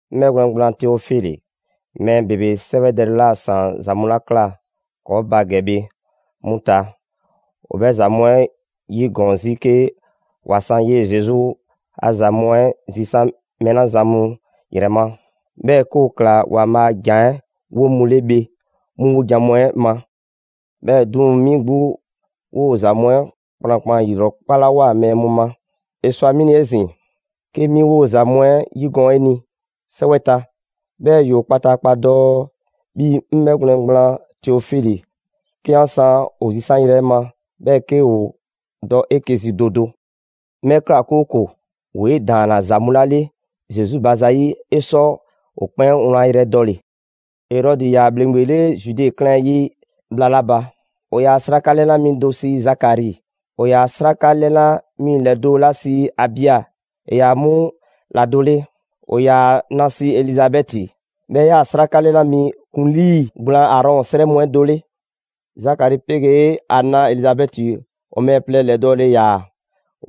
'Ŋ 'bhɛgwlɛn‑ gblaan Teofili, mɛɛ ‑bebe 'sɛwɛdɛle 'la ‑saan ‑za mu 'la ꞊kla ‑kɔɔ' ba ‑gɛ bhe, 'mu ta, ‑o 'bhɛ ‑za mu 'ɛ 'yigɔɔn 'zi 'ke ‑wa san 'yee‑ Zesu a ‑za mu 'ɛ zisaan‑ mɛɛ 'la zan mu 'yrɛ ma, 'bhɛɛ‑ 'ke ‑o ꞊kla ‑Waanbhaa' a ‑Jan 'ɛ 'wo mu 'le bhe 'mu 'wojan‑ mu 'ɛ ma. 'Bhɛɛ‑ 'duŋ‑, 'mi 'gbu 'woo‑ ‑za mu 'ɛ kplankplan ‑yilrɔkpalawoa mɛɛ mu ma; ‑e ꞊swa 'mi ni 'ezin‑ 'ke 'mi 'woo‑ ‑za mu 'ɛ ‑yigɔɔn' 'e ni 'sɛwɛ ta, 'bhɛɛ‑ 'yoo‑ kpataakpa dɔ, 'bhi 'ŋ 'bhɛgwlɛn‑ gblaan Teofili, 'ke 'an san ‑o zisanyrɛ 'ɛ ma, 'bhɛɛ‑ 'ke ‑o dɔ 'eke‑ zi do do. 'Ŋ 'bhɛ ꞊kla, 'kooko‑ ‑woo 'e ‑daanna ‑za mu 'la 'le Zesu ba zayi', 'e sɔ ‑o 'kpɛn wlan yrɛ dɔle‑. Erɔdi ‑yaa ‑bhleŋgbe 'le Zude 'klɛɛn 'ɛ yi bhla 'la ba, ‑o ‑yaa 'sraka 'lɛna mi do sii Zakari; ‑o ‑yaa 'sraka 'lɛna mu ‑lɛdo' 'la sii Abia ‑e 'yaa‑ 'mu ‑la do 'le. ‑O ‑yaa ‑a na sii Elizabɛti, 'bhɛɛ‑ 'bhɛ 'yaa‑ 'sraka 'lɛna mi ‑kuŋlii gblaan Aarɔn 'srɛ mu 'ɛ do 'le. Zakari pegee' ‑a na Elizabɛti, ‑o mɛɛ plɛ ‑lɛdɔɔle ‑yaa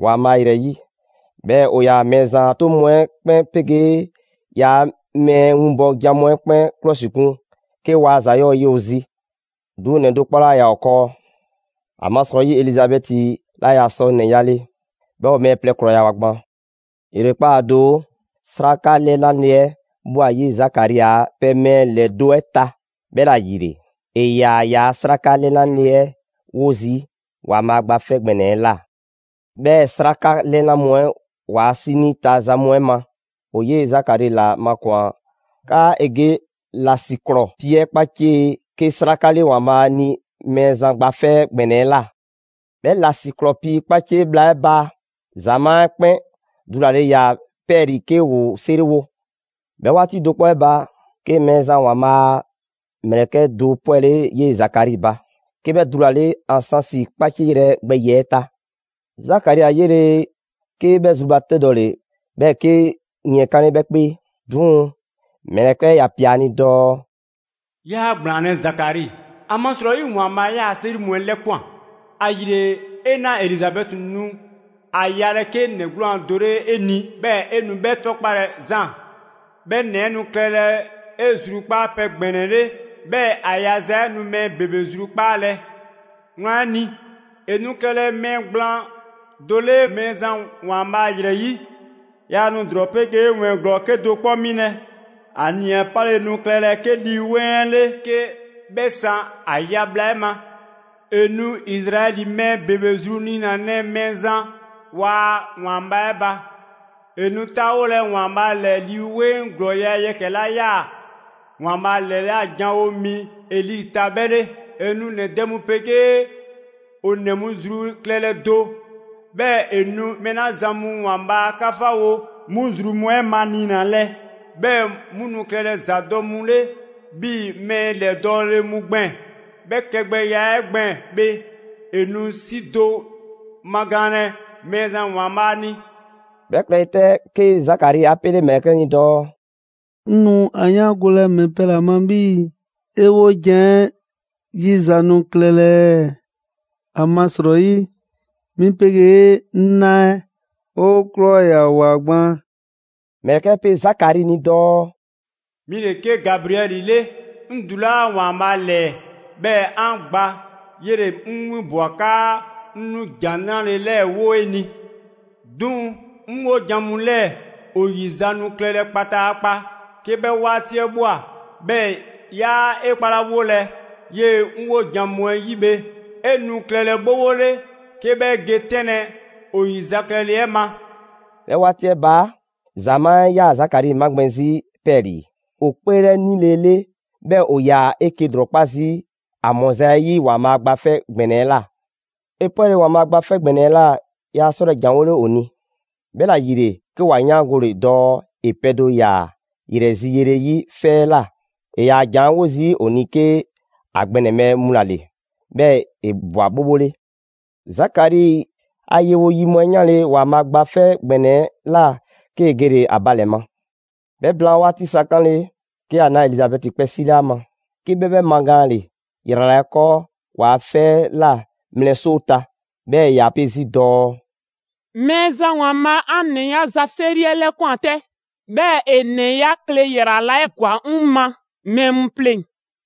‑Waanbhaa' ‑yrɛ 'yi, 'bhɛɛ‑ ‑o ‑yaa Mɛɛzan a 'toŋ mu 'ɛ 'kpɛn 'pegee ‑yaa' mɛɛ winbɔ jan mu 'ɛ 'kpɛn 'klɔsikun 'ke waa ‑za 'yɔɔ‑ ye ‑o zi. 'Duŋ‑ ‑nɛ do 'kpɔ 'laa ‑yaa ‑o 'kɔɔ, ‑amasrɔyi Elizabɛti 'laa ‑yaa sɔ ‑nɛ 'yale, 'bhɛɛ‑ ‑o mɛɛ plɛ ‑krɔyawoa gban. ‑Yrekpaa' do, 'sraka 'lɛna ye 'ɛ ꞊bhwa 'yee‑ Zakari a pɛ mɛɛ ‑lɛdo' 'ɛ ta. 'Bhɛla‑ ‑yile, ‑e ‑yaa ‑yaa' 'sraka 'lɛna ye 'ɛ 'wo zii' ‑Waanbhaa' Gba 'Fɛ ‑Gbɛnɛ 'ɛ ꞊la. 'Bhɛɛ‑ 'sraka 'lɛna mu 'ɛ ‑waa' 'sinii ta za mu 'ɛ ma, ‑o 'yee‑ Zakari ‑la makwan‑ 'kaa‑ ‑e ge ‑lasiklɔɔ pii 'ɛ 'kpacie 'ke 'sraka 'le ‑Waanbhaa' ni Mɛɛzan Gba 'Fɛ ‑Gbɛnɛ 'ɛ ꞊la. 'Bhɛ ‑lasiklɔɔ pii 'kpacie bhla 'ɛ ba, ‑zamaa' 'ɛ 'kpɛn ‑dulale ‑yaa 'pɛɛlii‑ 'ke ‑woo 'seriwo. 'Bhɛ 'waati do 'kpɔ 'ɛ ba, 'ke Mɛɛzan ‑Waanbhaa' a ‑mlɛkɛ' 'ɛ do 'pwɛle 'yee‑ Zakari ba. 'Ke 'bhɛ ‑dulale ansansi 'kpacieyrɛ 'ɛ gbɛ ‑yiɛ' ta. Zakari 'a 'yele, 'ke 'bhɛ zrubatɛdɔle, 'bhɛɛ‑ 'ke yiɛnkanle 'bhɛ 'kpee. 'Duŋ‑, ‑mlɛkɛ' 'ɛ ‑ya ‑pia ‑a ni dɔɔ: «'Yaa ‑gblaanlɛ' Zakari, ‑amasrɔyi ‑Waanbhaa' 'yaa‑ 'seri mu 'ɛ 'lɛkwan‑, ‑ayile 'e 'na Elizabɛti nu ‑a yalɛ 'ke ‑nɛ 'gwlaan‑ do 'le 'e ni; 'bhɛɛ‑ 'e nu 'bhɛ 'tɔkpalɛ Zaan. 'Bhɛ ‑nɛ 'ɛ nu klɛlɛ 'e zrukpaapɛ ‑gbɛnɛ 'le, 'bhɛɛ‑ ‑a yaza 'ɛ nu mɛɛ ‑bebe zrukpaalɛ. Wlan 'ɛ ni, ‑e nu klɛlɛ mɛɛ gblaan do 'le Mɛɛzan ‑Waanbhaa' ‑yrɛ 'yi. Yaa nu ‑drɔɔ 'pegee ‑wɛɛn ‑glɔɔ 'kedo‑ 'kpɔ 'milɛ‑. ‑A nii‑ 'ɛ 'pale nu klɛlɛ 'ke Lii 'Weŋ 'ɛ 'le 'ke 'bhɛ san ‑a ya bhla 'ɛ ma. ‑E nu Izraɛli mɛɛ ‑bebe zru niinalɛ Mɛɛzan waa ‑Waanbhaa' 'ɛ ba. ‑E nu 'taawolɛ ‑Waanbhaa' ‑lɛɛ Lii 'Weŋ ‑glɔɔya' yɛkɛ‑ 'la 'yaa‑ ‑Waanbhaa' ‑lɛla' janwo mi Eli ta 'bhɛɛ‑ 'le. ‑E nu ‑nɛ dɛ mu 'pegee ‑o ‑nɛ mu zru klɛlɛ do, 'bhɛɛ‑ ‑e nu mɛɛ 'la zan mu ‑Waanbhaa' 'kafawo 'mu zru mu 'ɛ maniinalɛ, 'bhɛɛ 'mu nu klɛlɛ ‑zadɔ' mu 'le 'bhii‑ ‑ mɛɛ ‑lɛdɔɔle mu gbɛɛn‑. 'Bhɛ klɛgbɛya 'ɛ gbɛɛn‑ bhe, 'e nu 'si do magaanlɛ Mɛɛzan ‑Waanbhaa' ni.» 'Bhɛ klɛle 'tɛ 'ke Zakari 'a 'pele ‑mlɛkɛ' 'ɛ ni dɔɔ: «'Ŋ nu ‑a 'yaangolɛ ‑mɛ pɛ ‑la ma 'bhii‑ 'e 'wojan‑ 'ɛ 'yiza‑ nu klɛlɛ ɛɛ? ‑Amasrɔyi 'mi 'pegee 'ŋ 'na 'ɛ 'o ‑krɔyawoa gban.» ‑Mlɛkɛ' pe Zakari ni dɔɔ: «'Mi le 'ke Gabriɛli 'le, 'ŋ dulaa' ‑Waanbhaa' ‑lɛɛ 'bhɛɛ‑ 'an gba, 'yele‑ 'ŋ 'winbwa‑ 'kaa 'ŋ nu ‑jan 'nrale‑ 'lɛɛ‑ 'wo 'e ni. 'Duŋ‑ 'ŋ 'wojan‑ mu 'lɛɛ‑ ‑o ‑yi za nu klɛlɛ kpataakpa 'ke 'bhɛ 'waati 'ɛ ꞊bhwa, 'bhɛɛ‑ 'yaa 'e 'kpalawolɛ 'yee‑ 'ŋ 'wojan‑ mu 'ɛ 'yi bhe, 'e nu klɛlɛ 'bhobho 'le 'ke 'bhɛ ge 'tɛnlɛ‑ ‑o ‑yizaklɛle 'ɛ ma.» 'Bhɛ 'waati 'ɛ ba, ‑zamaa' 'ɛ ‑yaa Zakari 'magbɛn‑ 'zi 'pɛɛlii‑, ‑o 'kpeelɛnilele, 'bhɛɛ‑ ‑o ‑yaa 'eke‑ ‑lrɔkpa' zii' ‑a ‑mɔza' 'ɛ 'yi ‑Waanbhaa' Gba 'Fɛ ‑Gbɛnɛ 'ɛ ꞊la. ‑E 'pwɛle‑ ‑Waanbhaa' Gba 'Fɛ ‑Gbɛnɛ 'ɛ꞊la, yaa 'sɔlɛ‑ ‑janwole ‑o ni. 'Bhɛla‑ ‑yile, 'ke ‑wa 'yaangole dɔɔ ‑e pɛ do ꞊ya ‑yrɛ zi yele 'yi 'fɛ 'ɛ ꞊la. ‑E ‑yaa ‑janwo zii' ‑o ni 'ke ‑a gbɛnɛbhɛ mu ‑la ‑le; 'bhɛɛ‑ ‑e ꞊bwa 'bhobho 'le. Zakari a yewo yi mu 'ɛ 'yanle‑ ‑Waanbhaa' a Gba 'Fɛ ‑Gbɛnɛ 'ɛ꞊la, 'kee‑ gele‑ ‑a ba ‑lɛ ma. 'Bhɛ blaan 'waati sa 'kanle‑, 'ke ‑a na Elizabɛti kpɛ 'sile ‑a ma. 'Ke 'bhɛ 'bhɛ magaanle ‑yrala' 'ɛ 'kɔɔ ‑waa 'fɛ 'ɛ ꞊la mlɛ 'soo ta. 'Bhɛ 'yaa‑ pe 'zi dɔɔ: «Mɛɛzan ‑Waanbhaa', 'an ‑nɛ 'yaza‑ 'seri 'ɛ 'lɛkwan‑ 'tɛ. 'Bhɛɛ‑ ‑e ‑nɛ 'ya kle ‑yrala' 'ɛ ‑gwa 'ŋ ma mɛɛ mu pleŋ‑.»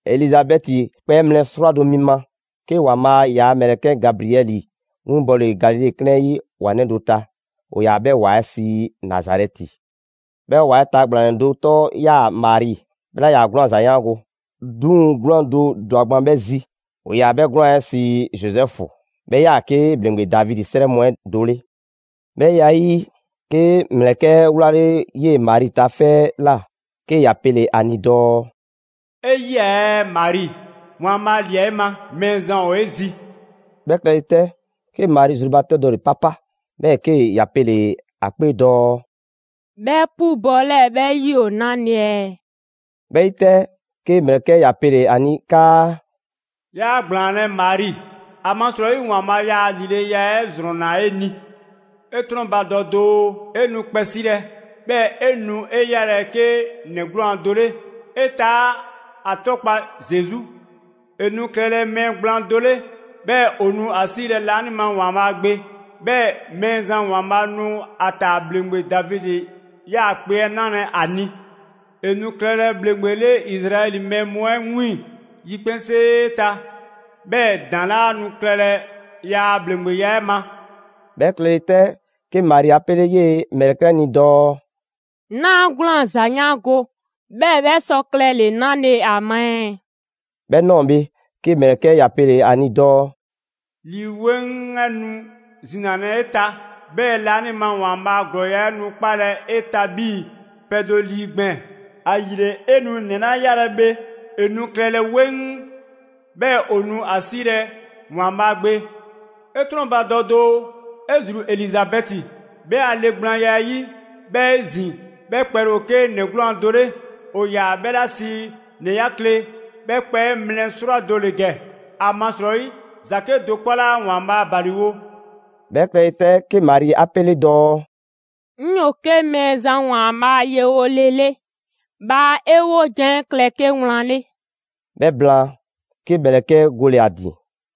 Elizabɛti kpɛ 'ɛ mlɛ 'srwado‑ mi ma, 'ke ‑Waanbhaa' ‑yaa ‑mlɛkɛ' Gabriɛli 'winbɔle Galile 'klɛɛn 'yi ‑wa 'nɛ do ta. ‑O ‑yaa 'bhɛ ‑wa 'ɛ sii Nazarɛti. 'Bhɛ ‑wa 'ɛ ta ‑gblanɛ do 'tɔ 'yaa‑ Mari. 'Bhɛ 'laa ‑yaa 'gwlaan‑ a ‑za 'yaango‑, 'duŋ‑ 'gwlaan‑ do ‑dwa gban 'bhɛ zi. ‑O ‑yaa 'bhɛ 'gwlaan‑ 'ɛ sii Zozɛfu. 'Bhɛ ‑yaa 'ke ‑Bhleŋgbe Davidi 'srɛ mu 'ɛ do 'le. 'Bhɛ ya 'ɛ 'yi, 'ke ‑mlɛkɛ' 'ɛ 'wlale‑ 'yee‑ Mari ta 'fɛ 'ɛ ꞊la, 'ke ‑ya pele‑ ‑a ni dɔɔ: «'E 'yia‑ ɛɛ Mari, ‑Waanbhaa' ‑lia 'e ma! Mɛɛzan ‑ ‑o 'e zi.» 'Bhɛ klɛle 'tɛ, 'ke Mari zrubatɛdɔle 'papa, 'bhɛɛ‑ 'ke ‑ya pele‑ ‑a 'kpee dɔɔ: «'Bhɛ 'pubɔ‑ 'lɛɛ‑ 'bhɛ 'yi ‑o 'nale‑ ɛɛ?» 'Bhɛ 'yi 'tɛ, 'ke ‑mlɛkɛ' ‑ya pele‑ ‑a ni 'kaa: «'Yaa ‑gblaanlɛ' Mari, ‑amasrɔyi ‑Waanbhaa' ‑yaa ‑lileya 'ɛ ‑zrɔnna 'e ni. 'E 'trɔnbadɔ doo: 'E nu kpɛ 'silɛ‑, 'bhɛɛ‑ 'e nu 'e 'yalɛ‑ 'ke ‑nɛ 'gwlaan‑ do 'le. 'E taa' 'a 'tɔkpa‑ Zesu. ‑E nu klɛlɛ mɛɛ gblaan do 'le, 'bhɛɛ‑ ‑o nu ‑a 'siilɛ‑ laanima ‑Waanbhaa' Gbe. 'Bhɛɛ‑ Mɛɛzan ‑Waanbhaa' nu ‑a ‑taa ‑bhleŋgbe Davidi 'yaakpe‑ 'ɛ 'nalɛ‑ ‑a ni. ‑E nu klɛlɛ ‑bhleŋgbe 'le Izraɛli mɛɛ mu 'ɛ 'wiiŋ‑ yikpɛnsee ta, 'bhɛɛ‑ ‑daŋ' 'laa nu klɛlɛ ‑yaa' ‑bhleŋgbeya 'ɛ ma.» 'Bhɛ klɛle 'tɛ, 'ke Mari 'a 'pele 'yee‑ ‑mlɛkɛ' 'ɛ ni dɔɔ: «'Naa 'gwlaan‑ ‑za 'yaango‑, 'bhɛɛ‑ bhɛ sɔ klɛle 'nale ‑a ma ɛɛ?» 'Bhɛ ꞊nɔɔ bhe, 'ke ‑mlɛkɛ' ‑ya pele‑ ‑a ni dɔɔ: «Lii 'Weŋ 'ɛ nu zinalɛ 'e ta, 'bhɛɛ‑ laanima ‑Waanbhaa' a ‑glɔɔya' 'ɛ nu 'kpalɛ‑ 'e ta 'bhii‑ pɛ do lii gbɛɛn‑. ‑Ayile 'e nu ‑nɛ 'la 'yalɛ‑ bhe, ‑e nu klɛlɛ 'weŋ, 'bhɛɛ‑ ‑o nu ‑a 'siilɛ‑ ‑Waanbhaa' Gbe. 'E 'trɔnbadɔ doo: 'e ‑zru Elizabɛti, 'bhɛ a le gblaanya 'ɛ 'yi, 'bhɛ 'ezin‑, 'bhɛ kpɛle ‑o 'ke ‑nɛ 'gwlaan‑ do 'le. ‑O ‑yaa 'bhɛ 'la sii ‑nɛ 'ya kle, 'bhɛ kpɛ 'ɛ mlɛ 'srwado‑ ‑le ‑gɛ. ‑Amasrɔyi ‑za 'kedo‑ 'kpɔ 'laa ‑Waanbhaa' ‑baliwo.» 'Bhɛ klɛle 'tɛ, 'ke Mari 'a 'pele dɔɔ: «'Ŋ 'yoo‑ 'ke Mɛɛzan ‑Waanbhaa' a yewo le 'le, bhaa 'e 'wojan‑ 'ɛ klɛ 'ke wlan 'le.» 'Bhɛ blaan, 'ke ‑mlɛkɛ' 'ɛ gole‑ ‑a ‑din.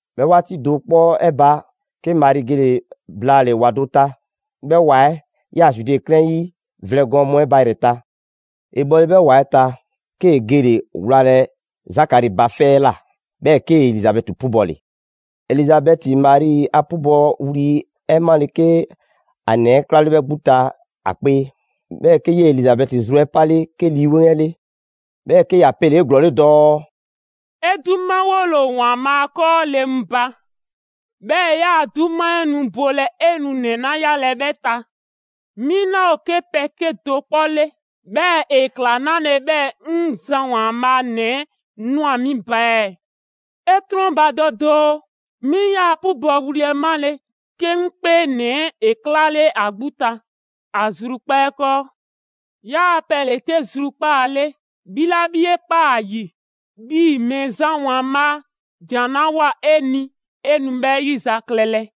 'Bhɛ 'waati do 'kpɔ 'ɛ ba, 'ke Mari gele‑ blaale‑ ‑wa do ta. 'Bhɛ ‑wa 'ɛ 'yaa‑ Zude 'klɛɛn 'yi vlɛ gɔɔn mu 'ɛ ba ‑yrɛ ta. ‑E bhɔle 'bhɛ ‑wa 'ɛ ta, 'kee‑ gele‑ wlalɛ Zakari ba 'fɛ 'ɛ ꞊la; 'bhɛɛ‑ 'kee‑ Elizabɛti 'pubɔle. Elizabɛti Mari a 'pubɔwli 'ɛ 'male‑ 'ke ‑a ‑nɛ 'ɛ 'klale 'bhɛ 'gbu ta ‑a 'kpee. 'Bhɛɛ‑ 'ke 'yee‑ Elizabɛti zru 'ɛ 'pale 'ke Lii 'Weŋ 'ɛ 'le. 'Bhɛɛ‑ 'ke ‑ya pele‑ 'eglɔɔle dɔɔ: «'E 'dumawole ‑o ‑Waanbhaa 'kɔɔ le mu ba, 'bhɛɛ‑ ‑yaa' 'duma 'ɛ nu bolɛ 'e nu ‑nɛ 'la 'yalɛ‑ 'bhɛ ta. 'Mi 'laa ‑o 'ke pɛ 'kedo‑ 'kpɔ 'le, 'bhɛɛ‑ ‑e ‑kla 'nale‑ 'bhɛɛ‑ 'ŋ Zan ‑Waanbhaa' nɛɛ 'ɛ ꞊nwa 'mi ba ɛɛ? 'E 'trɔnbadɔ doo, 'mi 'yaa‑ 'pubɔwli 'ɛ 'male‑, 'ke 'ŋ 'kpee ‑nɛ 'ɛ ‑e 'klale ‑a 'gbu ta ‑a zrukpaa' 'ɛ 'kɔɔ. 'Yaa‑ pɛ ‑le 'ke zrukpaa' 'le, 'bhi 'la 'bhi 'e ꞊kpaa ‑a ‑yi 'bhii‑ Mɛɛzan ‑Waanbhaa' ‑jan 'la ꞊woa 'e ni ‑e nu 'bhɛ 'yizaklɛlɛ.»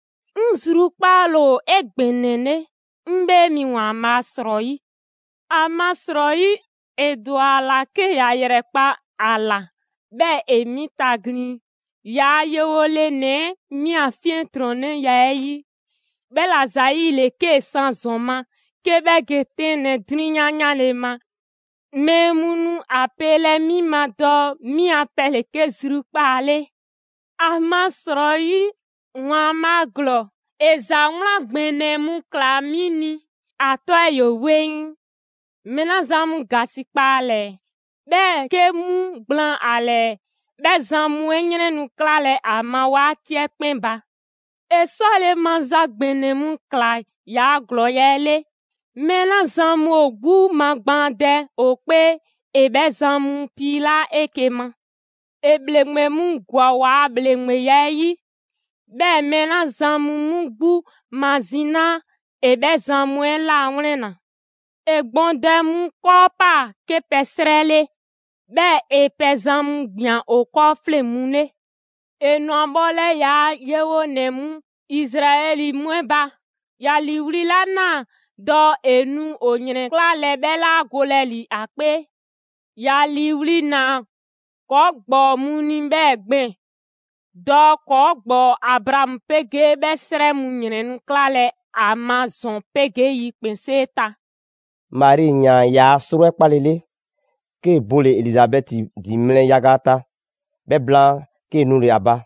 'Ŋ zrukpaale ‑o 'egbɛnɛle, 'ŋ 'Bhee mi ‑Waanbhaa' ‑srɔyi'. ‑Amasrɔyi, ‑e ‑dwa ‑a ‑la 'ke ‑ya ‑yrɛkpa' ‑a ‑la, 'bhɛɛ‑ ‑e 'mi taglin, yaa yewo le ‑nɛ 'ɛ, 'mi a 'fiɛntrɔnnɛya 'ɛ 'yi. 'Bhɛla‑ ‑zayile 'kee‑ san ‑zɔn ma, 'ke 'bhɛ ge 'tɛnlɛ‑ 'drunyan 'yanle‑ ma, mɛɛ mu nu ‑a pelɛ 'mi ma dɔɔ 'bhi a pɛ ‑le 'ke zrukpaa' 'le. ‑Amasrɔyi ‑Waanbhaa' ‑Glɔɔ, ‑e ‑za 'wlan ‑gbɛnɛ mu ꞊kla 'mi ni. ‑A 'tɔ 'ɛ ‑yoo 'weŋ. Mɛɛ 'la zan mu ‑gasikpa ‑a ‑lɛɛ, 'bhɛɛ‑ 'ke 'mu gblaan ‑a ‑lɛɛ, 'bhɛ zan mu 'ɛ ‑yrɛn nu 'klalɛ‑ ‑a ma 'waati 'ɛ 'kpɛn ba. ‑E 'sɔle‑ maza ‑gbɛnɛ mu ꞊kla yaa ‑glɔɔya' 'ɛ 'le. Mɛɛ 'la zan mu ‑o 'gbu magbaandɛ ‑o 'kpee, ‑e 'bhɛ zan mu ‑piilaa' 'eke‑ ma. ‑E bhleŋgbe mu ‑gwa ‑waa ‑bhleŋgbeya 'ɛ 'yi. 'Bhɛɛ‑ mɛɛ 'la zan mu 'mu 'gbu mazinaa, ‑e 'bhɛ zan mu 'ɛ ‑lawlɛnna. ‑E gbɔndɛ mu 'kɔɔ 'paa‑ 'ke pɛ 'srɛ 'le, 'bhɛɛ‑ ‑e pɛzan mu ‑gbian ‑o 'kɔɔ 'fleŋ‑ mu 'le. ‑E ‑nwa bhɔlɛ ‑yaa' yewonɛ mu Izraɛli mu 'ɛ ba, ‑ya ‑liiwli' 'la ‑naa dɔɔ ‑e nu ‑o ‑yrɛnklalɛ 'bhɛ 'la golɛ ‑li ‑a 'kpee. ‑Ya ‑liiwli' ‑naa ‑kɔɔ' ‑gbɔɔ mu ni 'bhɛɛ‑ gbɛɛn‑, dɔɔ ‑kɔɔ' ‑gbɔɔ Abraamu 'pegee 'bhɛ 'srɛ mu ‑yrɛn nu 'klalɛ ‑a ma ‑zɔn 'pegee yikpɛnsee ta.» Mari ‑yaan ‑yaa' 'sro 'ɛ 'kpalele, 'kee‑ bole‑ Elizabɛti ‑din mlɛ yaga ta. 'Bhɛ blaan, 'kee‑ nule‑ ‑a ba.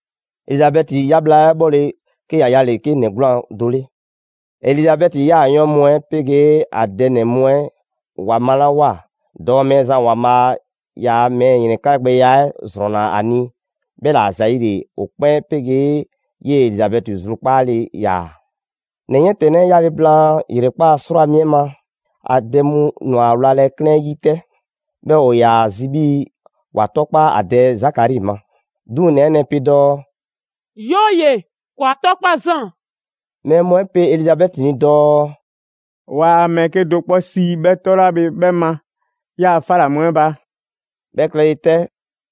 Elizabɛti 'ya bhla 'ɛ 'bhɔle‑, 'ke ‑ya yale‑ 'ke ‑nɛ 'gwlaan‑ do 'le. Elizabɛti yaayɔɔn' mu 'ɛ 'pegee ‑a dɛ ‑nɛ mu 'ɛ ‑wa malawoa dɔɔ Mɛɛzan ‑Waanbhaa' ‑yaa mɛɛ ‑yrɛnklagbɛya 'ɛ ‑zrɔnna ‑a ni; 'bhɛla‑ ‑zayile ‑o 'kpɛn 'pegee 'yee‑ Elizabɛti zrukpaale ‑yaa. ‑Nɛ 'yiɛntɛnnɛ 'ɛ 'yale‑ blaan ‑yrekpaa' 'srwaa‑ mi ma, ‑a dɛ mu ‑nwa ‑a wlalɛ 'klɛɛn 'yi 'tɛ. 'Bhɛɛ‑ ‑o ‑yaa zi 'bhii‑ ‑wa 'tookpa ‑a dɛ Zakari ma. 'Duŋ‑ ‑nɛ 'ɛ nɛɛ pe dɔɔ: «'Yooye‑, ‑kɔɔ' 'a 'tɔkpa Zaan.» Mɛɛ mu 'ɛ pe Elizabɛti ni dɔɔ: «'Waa mɛɛ 'kedo‑ 'kpɔ sii 'bhɛ 'tɔ 'la bhe 'bhɛ ma 'yaa‑ 'fa ‑la mu 'ɛ ba.» 'Bhɛ klɛle 'tɛ,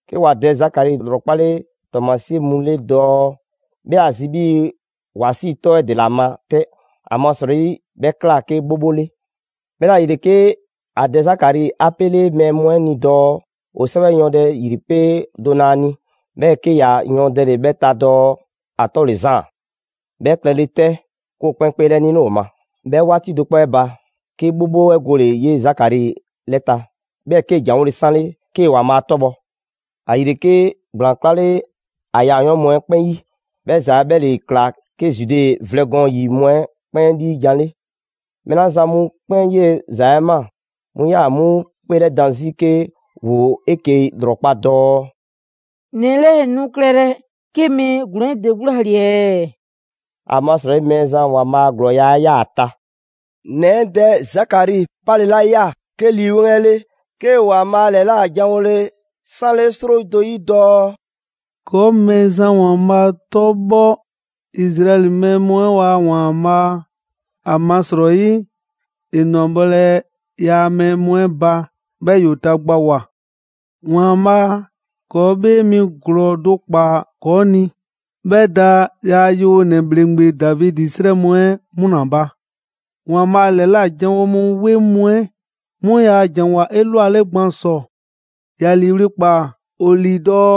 'ke ‑wa dɛ Zakari ‑lrɔkpale' ‑tɔɔmasie mu 'le dɔɔ 'bhɛ ‑a zi 'bhii‑ ‑wa 'sii‑ 'tɔ 'ɛ ‑dela ma 'tɛ; ‑amasrɔyi 'bhɛ ꞊kla 'ke 'bhobho 'le. 'Bhɛla‑ ‑yile, 'ke a dɛ Zakari 'a 'pele mɛɛ mu 'ɛ ni dɔɔ ‑o 'sɛwɛ yɔɔndɛ ‑yripee' do na a ni. 'Bhɛɛ‑ 'ke ‑ya yɔɔndɛle 'bhɛ ta dɔɔ: «‑A 'tɔ ‑le Zaan.» 'Bhɛ klɛle 'tɛ, 'ke ‑o 'kpɛn 'kpeelɛnile ‑o ma. 'Bhɛ 'waati do 'kpɔ 'ɛ ba, 'ke 'bhobho 'ɛ gole‑ 'yee‑ Zakari 'lɛ ta, 'bhɛɛ‑ 'kee‑ ‑janwole 'sanle 'kee‑ ‑Waanbhaa' 'tɔbhɔ‑. ‑Ayile, 'ke ‑gblaan 'klale ‑a yaayɔɔn' mu 'ɛ 'kpɛn 'yi. 'Bhɛ ‑za 'ɛ 'bhɛ ‑le ꞊kla 'ke Zude vlɛ gɔɔn ‑yi mu 'ɛ 'kpɛn 'liijan‑ 'le. Mɛɛ 'la zan mu 'kpɛn 'yee‑ ‑za 'ɛ 'maa‑, 'mu 'yaa‑ 'mu 'kpeelɛdan 'zi 'ke ‑woo 'eke‑ ‑lrɔkpa' dɔɔ: «‑Nɛ 'lɛɛ‑ nu klɛlɛ 'ke mɛɛ ‑glɔɔn 'ɛ ‑de 'gbu ‑la ‑le ɛɛ?» ‑Amasrɔyi Mɛɛzan ‑Waanbhaa' ‑glɔɔya' 'ɛ 'yaa‑ ‑a ta. ‑Nɛ 'ɛ dɛ Zakari 'pale‑ 'la 'yaa‑ 'ke Lii 'Weŋ 'ɛ 'le, 'kee‑ ‑Waanbhaa' ‑lɛlajanwole 'sanle 'sro do 'yi dɔɔ: «‑Kɔɔ' Mɛɛzan ‑Waanbhaa' 'tɔbhɔ, Izraɛli mɛɛ mu 'ɛ ‑waa' ‑Waanbhaa'. ‑Amasrɔyi ‑e ‑nwa bhɔlɛ ‑yaa' mɛɛ mu 'ɛ ba 'bhɛɛ‑ ‑yoo tagbawoa. ‑Waanbhaa' ‑kɔɔ 'Bhee mi ‑glɔɔ do ‑kpa ‑kɔɔ' ni. 'Bhɛ da ‑yaa' yewonɛ ‑bhleŋgbe Davidi 'srɛ mu 'ɛ 'mu ‑la ba. ‑Waanbhaa ‑lɛla' janwo mu 'weŋ mu 'ɛ 'mu ‑yaa' ‑janwoa 'elwale gban ‑sɔ. ‑Ya ‑liiwli' ‑kpaa ‑o ‑lii dɔɔ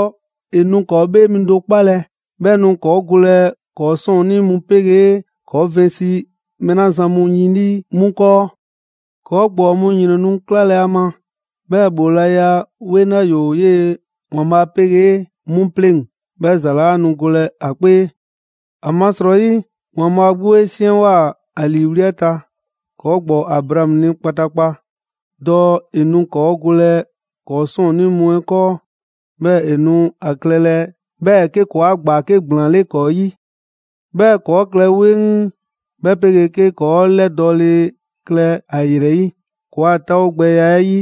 ‑e nu ‑kɔɔ' 'Bhee mi do 'kpalɛ‑, 'bhɛ nu ‑kɔɔ' golɛ ‑kɔɔ' 'sɔɔnnii mu 'pegee ‑kɔɔ' vɛnsi mɛɛ 'la zan mu yin 'lii 'mu 'kɔɔ. ‑Kɔɔ' ‑gbɔɔ mu ‑yrɛn nu 'klalɛ‑ ‑a ma, 'bhɛɛ‑ ‑bhoolaya 'weŋ la ‑yoo 'yee‑ ‑Waanbhaa 'pegee 'mu 'pleŋ‑, 'bhɛ ‑za 'laa nu golɛ ‑a 'kpee. ‹‑Amasrɔyi ‑Waanbhaa' 'gbu 'e 'siɛnwoa‑ ‑a ‑liiwli' 'ɛ ta ‑kɔɔ' ‑gbɔɔ Abraamu ni kpataakpa,› dɔɔ ‑e nu ‑kɔɔ' golɛ ‑kɔɔ' 'sɔɔnnii mu 'ɛ 'kɔɔ; 'bhɛɛ‑ ‑e nu a klɛlɛ 'bhɛɛ‑ 'ke ‑kɔɔa' gba 'ke ‑gblaan 'le ‑kɔɔ' 'yi. 'Bhɛɛ‑ ‑kɔɔ' klɛ 'weŋ, 'bhɛ 'pegee 'ke ‑kɔɔ' 'lɛdɔɔle klɛ ‑a ‑yrɛ 'yi ‑kɔɔa' 'taawogbɛya 'ɛ 'yi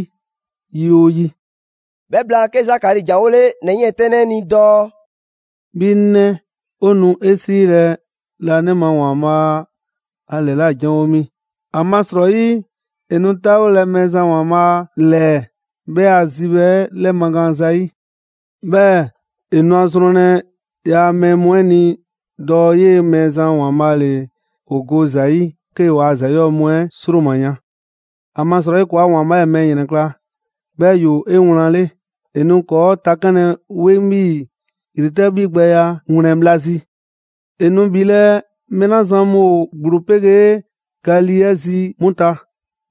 yi 'oo yi. 'Bhɛ blaan 'ke Zakari ‑janwole ‑nɛ 'yiɛntɛnnɛ 'ɛ ni dɔɔ: 'Bhi 'ŋ 'nɛ, ‑o nu 'e 'siilɛ‑ laanima ‑Waanbhaa' a ‑lɛla' janwo mi. ‑Amasrɔyi 'e nu 'taawolɛ Mɛɛzan ‑Waanbhaa' ‑lɛɛ 'bhɛ a zibhɛ 'ɛ 'lɛmagaan zayi'. 'Bhɛɛ‑ 'e nu a zrɔnlɛ ‑yaa' mɛɛ mu 'ɛ ni dɔɔ 'yee‑ Mɛɛzan ‑Waanbhaa' ‑le ‑o go ‑za yi 'kee‑ waa ‑za 'yɔɔ‑ mu 'ɛ 'sroma‑ yan. ‑Amasrɔyi ‑kɔɔa' ‑Waanbhaa' 'ɛ ‑e mɛɛ ‑yrɛnkla', 'bhɛɛ‑ ‑yoo 'ewlanle. ‑E nu ‑kɔɔ' takanlɛ 'weŋ 'bhii‑ ‑yretɛ' 'bhigbɛya ‑a ‑wlɛn bhla zi. ‑E nu ‑bhilɛ' mɛɛ 'la zan mu ‑o ‑gblo 'pegee ga lii 'ɛ zi 'mu ta,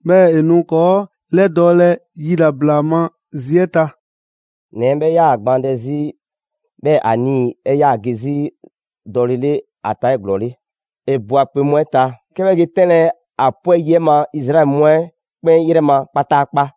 ‹'bhɛɛ‑ ‑e nu ‑kɔɔ' 'lɛdɔɔlɛ yilabla ma zi 'ɛ ta.›» ‑Nɛ 'ɛ 'bhɛ 'yaa‑ gbaandɛ 'zi, 'bhɛɛ‑ ‑a nii‑ 'ɛ 'yaa‑ ge zi dɔlele ‑a ta 'eglɔɔle. ‑E ꞊bwa ‑kpe mu 'ɛ ta, 'ke 'bhɛ ge 'tɛnlɛ‑ ‑a 'pwɛ yi ma Izraɛli mu 'ɛ 'kpɛn 'yrɛ ma kpataakpa.